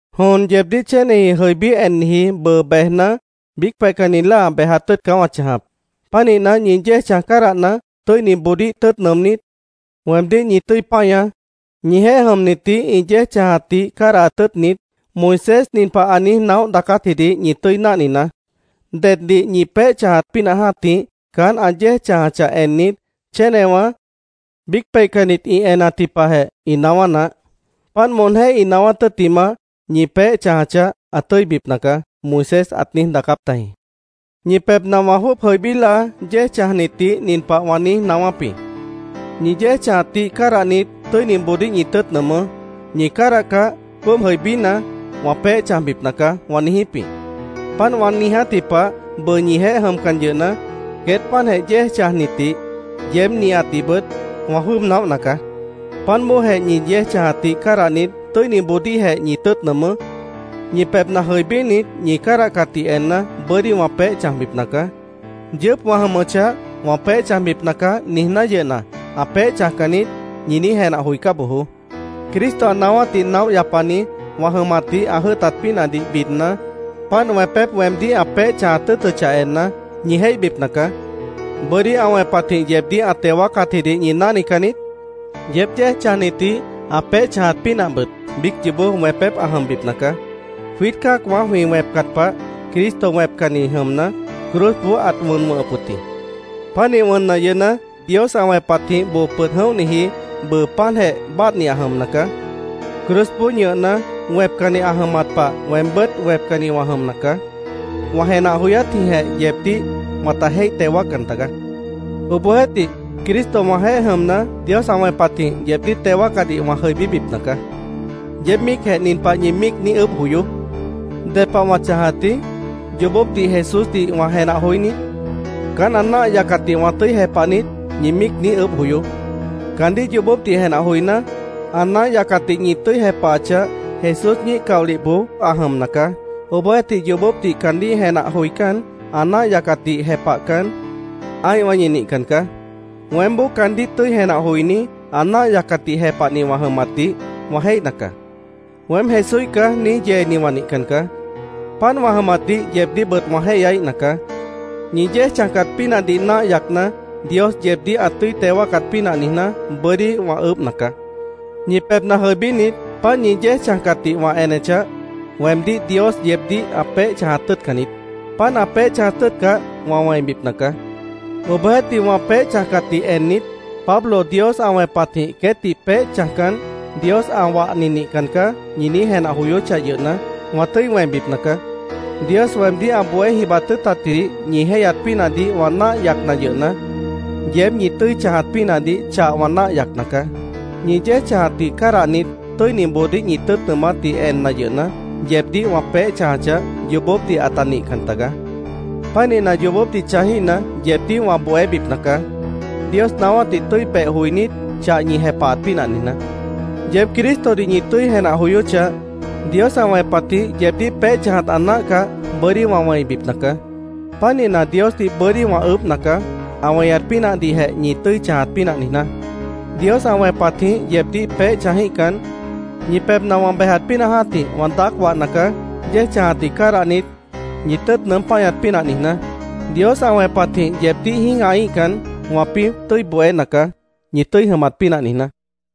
Jon yeebdíh chéneji jʉibí enniji bʉʉ bejna, biíc peihcanni láa bejat tʉ́ʉt caá wã chãjap. Pánihna, ñi yéej chãj cádahna, tʉ́iniboodíh tʉ́ʉt nʉʉmnít, weemdíh ñi tʉ́i páñaá. Ñijeéh jʉmnitdih ĩ yéej chãjatdih cádahat tʉ́ʉtnit, Moisés nin pah ã niíj naóh daacátjidih ñi tʉ́i náhninaá: “Deddih ñi peéh chãjat pínah jã́tih, caán ã yéej chãjachah ennit, chénewã, biíc peihcannit ĩ enatji pahjeh ĩ naáwá naáh. Páant moonjéh ĩ naáwát tʉ́ttimah, ñi peéh chãjachah, ã tʉ́ibipna caá”, Moisés ãt niíj daacáp tajĩ. Ñi pebhna wã jwʉ́ʉb jʉibí láa yéej chãjnitdih nin pah wã niíj naáwáp jĩ: “Ñi yéej chãjatdih cádahnit, tʉ́iniboodíh ñi tʉ́ʉt nʉʉmʉ́. Ñi cádahcah, jwʉ́ʉb jʉibína, wã peéh chãjbipna caá”, wã niijíp jĩ. Páant wã niijátji pah, bʉʉ ñijeéh jʉmcan yʉhna, queét páantjeh yéej chãjnitdih, yeéb nihatdihbʉt, wã jwʉ́ʉb naóhna caá. Páant bóojeh, ñi yéej chãjatdih cádahnit, tʉ́iniboodíhjeh ñi tʉ́ʉt nʉʉmʉ́. Ñi pebhna jʉibínit, ñi cádahcatdih enna, bʉ́dí wã peéh chãjbipna caá. Yʉʉ́p wã jʉmʉchah, “ ‘Wã peéh chãjbipna caá’, niijná yʉhna, ã peéh chãjcan niít”, ñi niíj jenah joicá bojoó. Cristo ã naáwátdih naóh yapani wã jʉmatdih ã jʉ́ʉtat pínahdih bidna, páant wẽpép weemdíh ã peéh chãjat tʉ́ʉtʉchah enna, ñi jéihbipna caá. ¿Bʉ́dí ã wẽpatjĩh yeebdíh ã teo wáacatjidih ñi náhnican niít? Yeéb yéej chãjnitdih ã peéh chãjat pínahbʉt biíc yoobó wẽpép ã jʉmbipna caá. Jwiít cã́acwã jwĩ wẽpcat pah Cristo wẽpcanni jʉmna, cruzboó ãt wʉn wʉ̃hʉp wʉ̃t jĩ. Pánih wʉnna yʉhna, Dios ã wẽpatjĩh boo pʉd jʉ̃óhniji, bʉʉ páantjeh báadhni ã jʉmna caá. Cruzboó ñʉhna, wẽpcanni ã jʉmat pah weembʉ́t wẽpcanni wã jʉmna caá. Wã jenah joyátjĩhjeh yeebdíh wãta jéih teo wáaccan tagaá. Obohjeéhtih, Cristo wãjeéh jʉmna, Dios ã wẽpatjĩh yeebdíh teo wáacadih wã jʉibíbipna caá. Yeéb míicjeh nin pah ñi míic niíj ʉʉ́bh joyoó: “¿Ded pah wã chãjatji? ¿Yoobópdih Jesúsdih wã jenah joí niít? ¿Caán ã náah yacatdih wã tʉ́i jepah niít?” ñi míic niíj ʉʉ́bh joyoó. Caandíh yoobópdih jenah joiná, ã náah yacatdih ñi tʉ́i jepahachah, Jesús ñíih caolihboó ã jʉmna caá. Obohjeéhtih, yoobópdih caandíh jenah joicán, ã náah yacatdih jepahcan, ã́ihwã ñi nihcan caá. Weémboó caandíh tʉ́i jenah joiní, ã náah yacatdih jepahni wã jʉmatdih wã jéihna caá. “Weém Jesúíh caá”, niíj yeeni wã nihcan caá. Páant wã jʉmatdih yeebdíhbʉt wã jéihyaíhna caá. Ñi yéej chãjcat pínahdih náah yacna, Dios yeebdíh ã tʉ́i teo wáacat pínah niijná, bʉ́dí wã ʉʉ́bhna caá. Ñi pebhna jʉibínit, páant ñi yéej chãjcatdih wã enechah, weemdíh Dios yeebdíh ã peéh chãjat tʉ́ʉtcan niít. Páant ã peéh chãjat tʉ́ʉtcah, wã wẽibipna caá. Obohjeéhtih wã peéh chãjcatdih ennit, “Pablo Dios ã wẽpatjĩh queétdih peéh chãjcan, Dios ã wahni nihcan nacaá”, ñi niíj jenah joyóchah yʉhna, wã tʉ́i wẽibipna caá. Dios weemdíh ã bohé jibat tʉ́ʉtatjidih ñi jéihyat pínahdih wã náah yacna yʉhna, yeéb ñi tʉ́i chãjat pínahdih chah wã náah yacna caá. Ñi yéej chãjatdih cádahnit, tʉ́iniboodíh ñi tʉ́ʉt nʉʉmátdih enna yʉhna, yeebdíh wã peéh chãjachah, yoobópdih ãta nihcan tagaá. Pánihna, yoobópdih chãjíhna, yeebdíh wã bohébipna caá, Dios naáwátdih tʉ́i beh joinít, chah ñi jepahat pínah niijná. Yeéb Cristodih ñi tʉ́i jenah joyóchah, Dios ã wẽpatjĩh yeebdíh peéh chãjat ã náahcah, bʉ́dí wã wẽibipna caá. Pánihna, Diosdih bʉ́dí wã ʉʉ́bhna caá, ã weñat pínahdihjeh ñi tʉ́i chãjat pínah niijná. Dios ã wẽpatjĩh yeebdíh peéh chãjíhcan, ñi pebhna wã bejat pínah jã́tih wã daác wahna caá, yéej chãjatdih cádahnit, ñi tʉ́ʉt nʉʉ́m páñat pínah niijná. Dios ã wẽpatjĩh yeebdíh jĩ́gahaíhcan, wãpĩ́ tʉ́i bohéna caá, ñi tʉ́i jʉmat pínah niijná.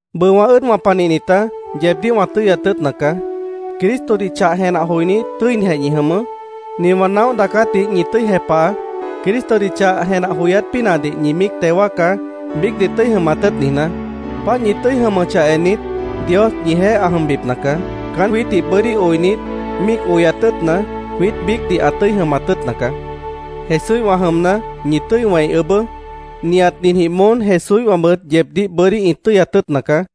Bʉʉ wã ʉ́ʉdwã panihnitá, yeebdíh wã tʉ́yat tʉ́ʉtna caá. Cristodih chah jenah joinít, tʉ́inijeh ñi jʉmʉʉ́. Nin wã naóh daacátdih ñi tʉ́i jepahaá. Cristodih chah jenah joyát pínahdih ñi míic teo wáacá, biícdih tʉ́i jʉmat tʉ́ʉt niijná. Páant ñi tʉ́i jʉmʉchah ennit, Dios ñijeéh ã jʉmbipna caá. Caán jwiítdih bʉ́dí oinit, míic oyat tʉ́ʉtna, jwiít biícdih ã tʉ́i jʉmat tʉ́ʉtna caá. Jesúíhwã jʉmna, ñi tʉ́i wẽi ʉʉ́bʉ́. Nihat ninjĩh moón Jesúíhwãbʉt yeebdíh bʉ́dí ĩ tʉ́yat tʉ́ʉtna caá.